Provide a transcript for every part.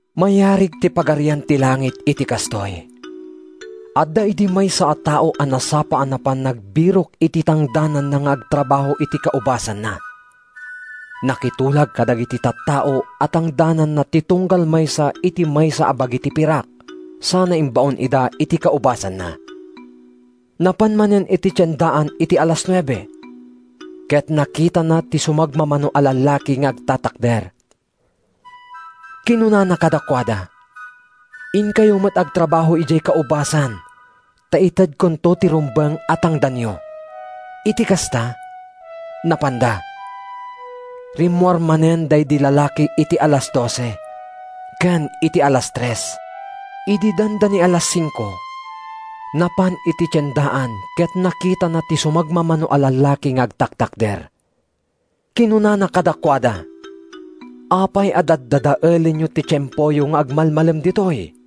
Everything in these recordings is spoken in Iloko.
“Mayarig ti Pagarian ti Langit iti kastoy: Adda idi maysa a tao a nasapa a napan nagbirok iti tangdananna nga agtrabaho iti kaubasanna. Nakitulag kadagiti tattao a tangdananna ti tunggal maysa iti maysa a bagi ti pirak sana imbaon ida iti kaubasanna. “Napan manen iti tiendaan iti alas nuebe, ket nakitana ti sumagmamano a lallaki nga agtatakder. Kinunana kadakuada, ‘Inkayo met agtrabaho idiay kaubasan ta itedkonto ti rumbeng a tangdanyo.’ “Iti kasta, napanda. Rimmuar manen daydi lalaki iti alas dose, ken iti alas tres. Idi dandani alas singko, napan iti tiendaan ket nakitana ti sumagmamano a lallaki nga agtatakder. Kinunana kadakuada, ‘Apay a daddadaelenyo ti tiempoyo nga agmalmalem ditoy?’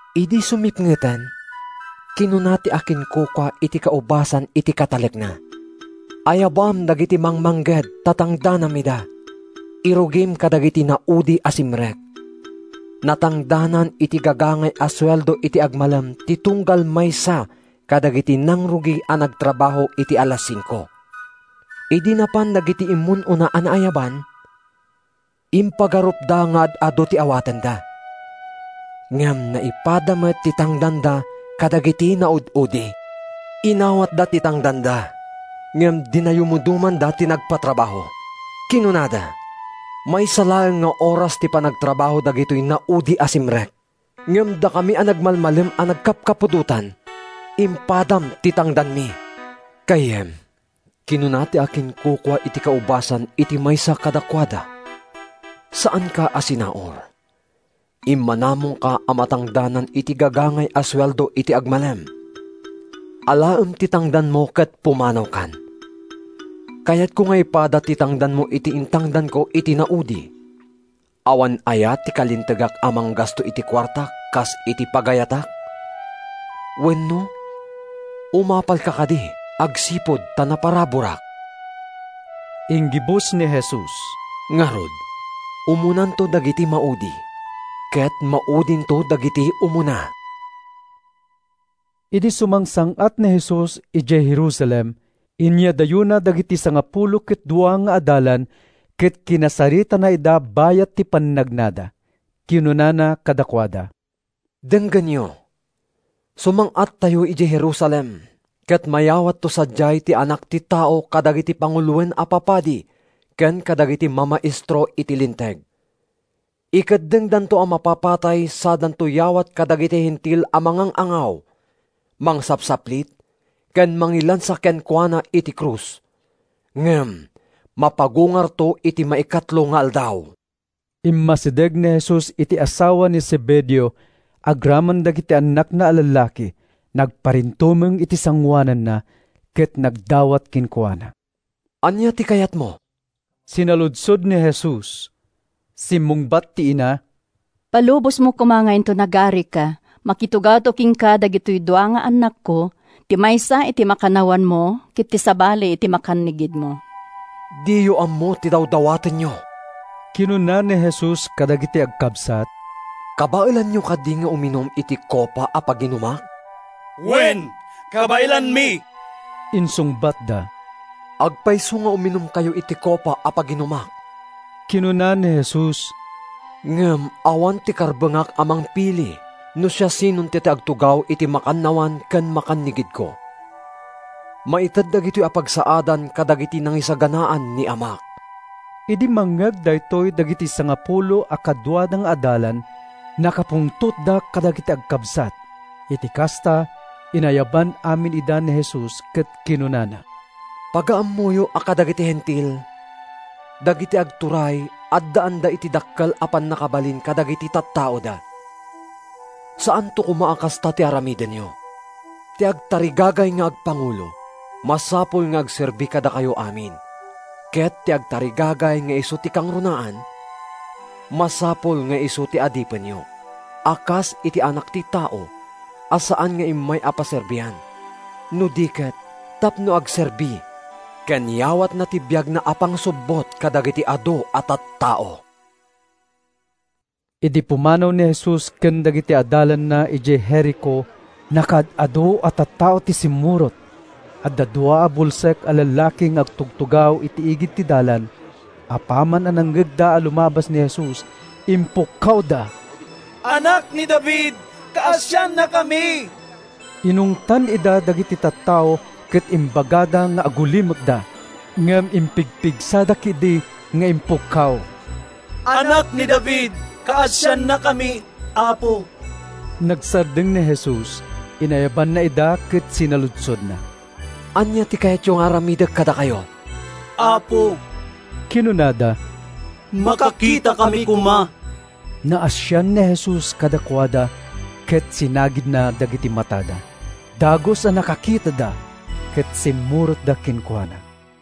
“Idi sumipngeten, kinuna ti akinkukua iti kaubasan iti katalekna, ‘Ayabam dagiti mangmangged ta tangdanam ida. Irugim kadagiti naudi a simrek.’ “Natangdanan iti gagangay a sueldo iti agmalem ti tunggal maysa kadagiti nangrugi a nagtrabaho iti alas singko. Idi napan dagiti immun-una a naayaban, impagarupda nga ad-adu ti awatenda. Ngem naipada met ti tangdanda kadagiti naud-udi. Inawatda ti tangdanda ngem dinayamudomanda ti nagpatrabaho. Kinunada, ‘Maysa laeng nga oras ti panagtrabaho dagitoy naudi a simrek. Ngem dakami a nagmalmalem a nagkapkapudotan, impadam ti tangdanmi.’ “ ‘Gayyem,’ kinuna ti akinkukua iti kaubasan iti maysa kadakuada, ‘saanka a sinaur. Immanamongka a matangdanan iti gagangay a sueldo iti agmalem. Alaem ti tangdanmo ket pumanawkan. Kayatko nga ipada ti tangdanmo iti intangdanko iti naudi. Awan aya ti kalintegak a manggasto iti kuartak kas iti pagayatak? Wenno, umapalka kadi agsipud ta naparaburak?’” Inggibus ni Jesus: “Ngarud, umunanto dagiti maudi, ket maudinto dagiti umuna.” Idi sumangsang-at ni Jesus idiay Jerusalem, inyadayona dagiti sangapulo ket dua nga adalan ket kinasaritana ida bayat ti pannagnada. Kinunana kadakuada, “Denggenyo, sumang-attayo idiay Jerusalem ket mayawatto sadiay ti Anak ti Tao kadagiti panguloen a papadi ken kadagiti mamaestro iti Linteg. Ikeddengdanto a mapapatay sadanto yawat kadagiti Hentil a mangang-angaw, mangsapsaplit ken mangilansa kenkuana iti krus. Ngem mapagungarto iti maikatlo nga aldaw.” Immasideg ken ni Jesus ti asawa ni Zebedeo agraman dagiti annakna a lallaki. Nagparintumeng iti sangoananna, ket nagdawat kenkuana. “Ania ti kayatmo?” sinaludsod ni Jesus. Simmungbat ti ina, “Ipalubosmo koma nga inton agarika, makitugawto kenka dagitoy dua nga annakko, ti maysa iti makannawanmo, ket ti sabali iti makannigidmo.” “Diyo ammo ti dawdawatenyo,” kinuna ni Jesus kadagiti agkabsat. “Kabaelanyo kadi ti uminum iti kopa a paginumak?” “Wen, kabaelanmi,” insungbatda. “Agpayso nga uminumkayto iti kopa a paginumak,” kinuna ni Jesus, “ngem awan ti karbengak a mangpili no siasinonto ti agtugaw iti makannawan ken makannigidko. Maited dagitoy a pagsaadan kadagiti nangisaganaan ni Amak.” Idi mangngeg daytoy dagiti sangapulo a kaduada nga adalan, nakapungtotda kadagiti agkabsat. Iti kasta, inayaban amin ida ni Jesus ket kinunana, “Pagaammoyo a kadagiti Hentil, dagiti agturay addaanda iti dakkel a pannakabalin kadagiti tattaoda. Saanto koma a kasta ti aramidenyo. Ti agtarigagay nga agpangulo, masapul nga agserbi kadakayo amin. Ket ti agtarigagay nga isu ti kangrunaan, masapul nga isu ti adipenyo, a kas iti Anak ti Tao a saan nga immay a paserbian no di ket tapno agserbi ken yawatna ti biagna a pangsubbot kadagiti adu a tattao.” Idi pumanaw ni Jesus ken dagiti adalanna idiay Jerico, nakaad-adu a tattao ti simmurot. Adda dua a bulsek a lallaki nga agtutugaw iti igid ti dalan. Apaman a nangngegda a lumabas ni Jesus, impukkawda, “Anak ni David! Kaasiannakami!” Inungtan ida dagiti tattao ket imbagada nga agulimekda. Ngem impigpigsada ketdi nga impukkaw, “Anak ni David, kaasiannakami, Apo!” Nagsardeng ni Jesus. Inayabanna ida ket sinaludsodna, “Ania ti kayatyo nga aramidek kadakayo?” “Apo,” kinunada, “makakitakami koma.” Naasian ni Jesus kadakuada ket sinagidna dagiti matada. Dagus a nakakitada, ket simmurotda kenkuana.